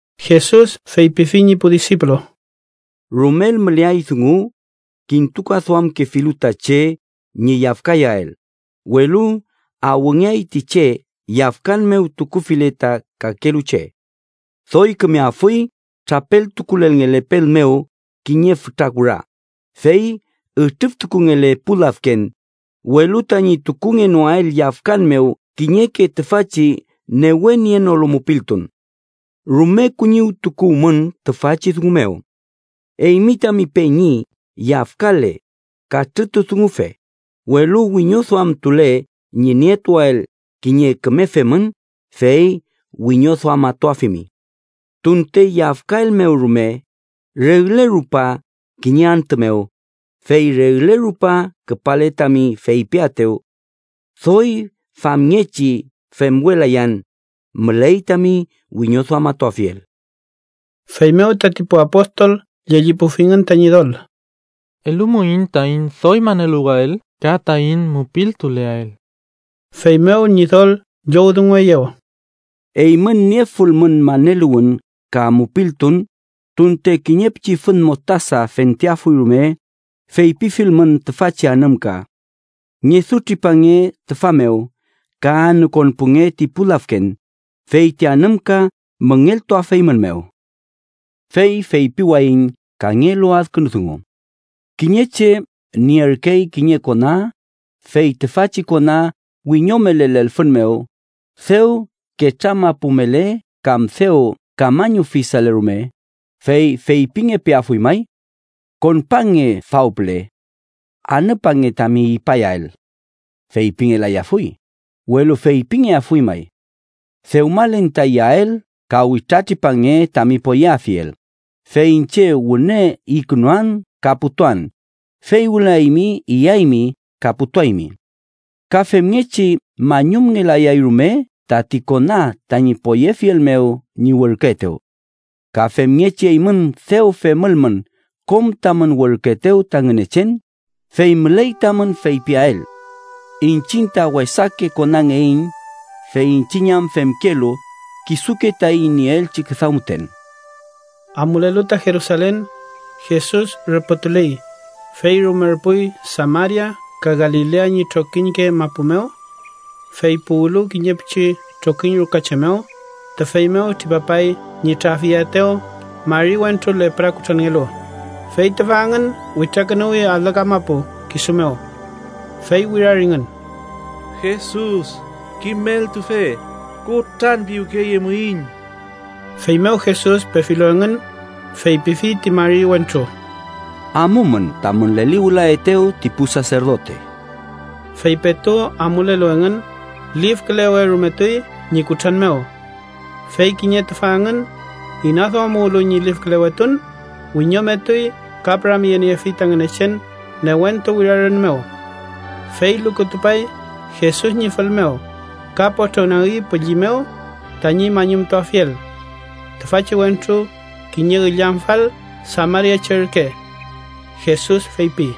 Jesus feypifi ñi pu disipulu: “Rumel müleay dungu kintukaduamkefilu ta che ñi yafkayael, welu ¡awngeay ti che yafkan mew tukufile ta kakelu che! Doy kümeafuy trapeltukulelngele pel mew kiñe fütra kura, fey ütrüftukungele pu lafken, welu tañi tukungenoael yafkan mew kiñeke tüfachi newe nienolu mupiltun. ¡Rume kuñiwtukuwmün tüfachi dungu mew! Eymi tami peñi yafkale, katrütudungufe, welu wiñoduamtule ñi nietuael kiñe küme femün, fey wiñoduamatuafimi. Tunte yafkaelmew rume regle rupa kiñe antü mew, fey regle rupa küpale tami feypiaetew: Doy famngechi femwelayan, müley tami wiñoduamatuafiel.” Feymew tati pu apostol llellipufingün ta Ñidol: —Elumuiñ taiñ doy maneluwael ka taiñ mupiltuleael. Feymew Ñidol llowdungueyew: —Eymün niefulmün maneluwün ka mupiltun, tunte kiñe pichi fün mostasa fenteafuy rume, feypifilmün tüfachi anümka: ‘Ngedutripange tüfa mew ka anükonpunge ti pu lafken’, fey ti anümka müngeltuafeymünmew. “Fey feypiwayiñ kangelu adkünu dungu: Kiñe che nierkey kiñe kona, fey tüfachi kona wiñomele lelfün mew, dew ketramapumele kam dew kamañufisale rume, ¿fey feypingepeafuy may: ‘Konpange faw püle. Anüpange tami ipayael?’ Feypingelayafuy, welu feypingeafuy may: ‘Dewmalen ta iyael, ka witratripange tami poyeafiel, fey iñche wüne ikünuan ka putuan, fey wüla eymi iyaymi ka putuaymi.’ Ka femngechi mañumngelayay rume tati kona tañi poyefiel mew ñi werküetew. Ka femngechi eymün, dew femülmün kom tamün werküetew ta Ngünechen, fey müley tamün feypiael: ‘Iñchiñ ta wesake konangeiñ, fey iñchiñ am femkelu kisuke taiñ nieelchi küdaw müten.’” Amulelu ta Jerusalen, Jesus rüpütuley, fey rumerpuy Samaria ka Galilea ñi trokiñke mapu mew. Fey puwlu kiñe pichi trokiñ ruka che mew, tüfey mew tripapay ñi trafyeaetew mari wentru lepra kutranngelu, fey tüfa engün witrakünuwi alü kamapu kisu mew. Fey wiraringün: —¡Jesus, Kimeltufe, kutranpiwkeyemuiñ! Feymew Jesus pefilu engün, feypifi ti mari wentru: —Amumün tamün leliwülaetew ti pu saserdote. Fey petu amulelu engün, lifkülewerumetuy ñi kutran mew. Fey kiñe tüfa engün, inaduamuwlu ñi lifkülewetun, wiñometuy ka püramyeniefi ta Ngünechen newentu wirarün mew. Fey lukutupay Jesus ñi fül mew, ka potrongnagi pülli mew tañi mañumtuafiel. Tüfachi wentru kiñe illamfal samariache ürke. Jesus feypi: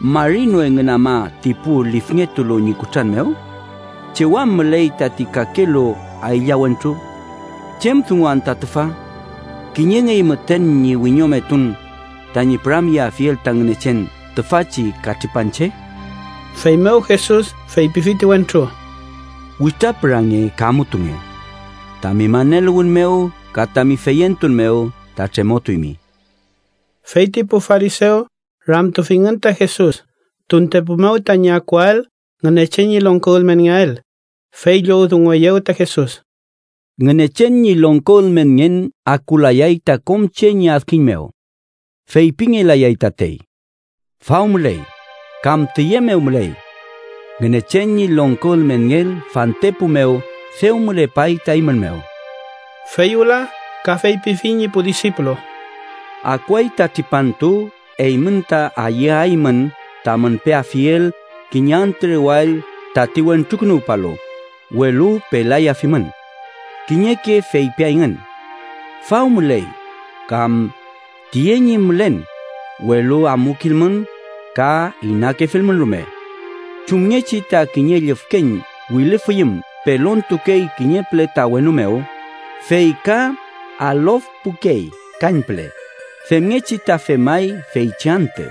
—¿Mari no engün ama ti pu lifngetulu ñi kutran mew? ¿Chew am müley tati kakelu aylla wentru? ¿Chem dungu anta tüfa? ¡Kiñengey müten ñi wiñometun tañi püramyeafiel ta Ngünechen tüfachi katripanche! Feymew Jesus feypifi ti wentru: —Witrapürange ka amutunge. Tami maneluwün mew ka tami feyentun mew ta tremotuymi. Fey ti pu farisew ramtufingün ta Jesus tuntepu mew tañi akuael Ngünechen ñi longko ülmenngeael, fey llowdungueyew ta Jesus: —Ngünechen ñi longko ülmenngen akulayay ta kom che ñi adkiñ mew. Feypingelayay tatey: ‘Faw müley’, kam ‘tüye mew müley’. Ngünechen ñi longko ülmenngen fantepu mew dew mülepay ta eymün mew. Fey wüla ka feypifi ñi pu disipulu: —Akuay ta tripantu eymün ta ayüaymün tamün peafiel kiñe antü rewall tati Wentrukünuwpalu, welu pelayafimün. Kiñeke feypiayngün: ‘Faw müley’ kam ‘tüye ñi mülen’, welu amukilmün ka inakefilmün rume. Chumngechi ta kiñe llüfkeñ wilüfiyüm pelontukey kiñe püle ta wenu mew, fey ka alofpukey kañpüle, femngechi ta femay feychi antü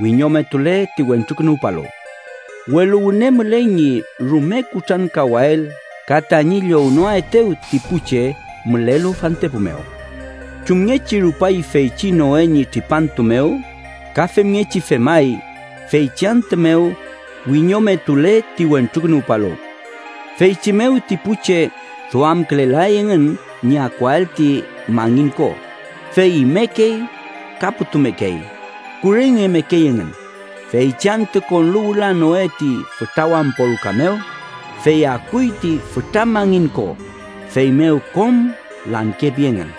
wiñometule ti Wentrukünuwpalu. Welu wüne müley ñi rume kutrankawael ka tañi llownoaetew ti pu che mülelu fantepu mew. “Chumngechi rupay feychi Noe ñi tripantu mew ka femngechi femay feychi antü mew wiñometule ti Wentrukünuwpalu. Feychi mew ti pu che duamkülelay engün ñi akuael ti mangin ko, fey imekey ka putumekey, kurengemekey engün, feychi antü konlu wüla Noe ti fütra wampo ruka mew, fey akuy ti fütra mangin ko, feymew kom lankepi engün.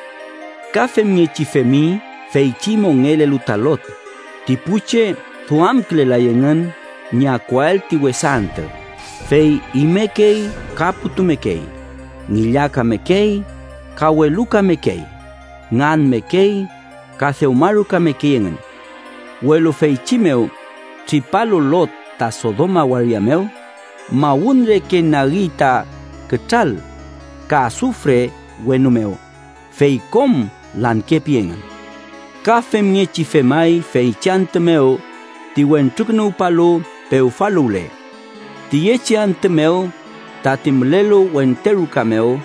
“Ka femngechi femi feychi mongelelu ta Lot: ti pu che duamkülelay engün ñi akuael ti wesa antü, fey imekey ka putumekey, ngillakamekey, ka welukamekey, nganmekey ka dewmarukamekey engün. Welu feychi mew tripalu Lot ta Sodoma waria mew, mawün reke nagi ta kütral ka asufre wenu mew, fey kom lankepi engün. “Ka femngechi femay feychi antü mew ti Wentrukünuwpalu pewfaluwle. Tüyechi antü mew, tati mülelu wente ruka mew,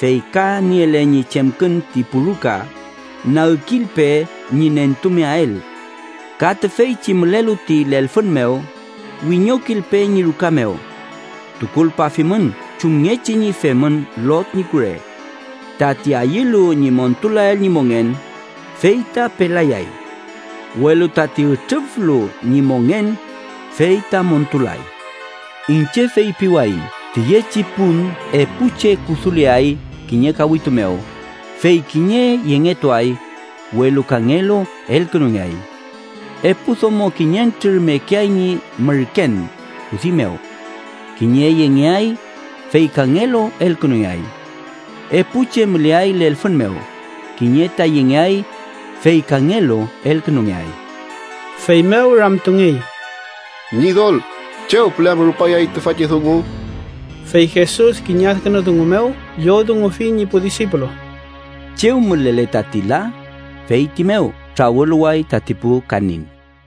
fey ka niele ñi chemkün ti pu ruka, nagkilpe ñi nentumeael. Ka tüfeychi mülelu ti lelfün mew, wiñokilpe ñi ruka mew. Tukulpafimün chumngechi ñi femün Lot ñi kure. Tati ayülu ñi montulael ñi mongen, fey ta pelayay. Welu tati ütrüflu ñi mongen, fey ta montulay. “Iñche feypiwayiñ tüyechi pun epu che kuduleay kiñe kawitu mew, fey kiñe yengetuay, welu kangelu elkünungeay. Epu domo kiñentrür mekeay ñi mürken kudi mew. Kiñe yengeay, fey kangelu elkünungeay. Epu che müleay lelfün mew: kiñe ta yengeay, fey kangelu elkünungeay.” Feymew ramtungey: —Ñidol, ¿chew püle am rupayay tüfachi dungu? Fey Jesus kiñe adkünu dungu mew llowdungufi ñi pu disipulu: —Chew mülele tati la, feyti mew trawüluway tati pu kanin.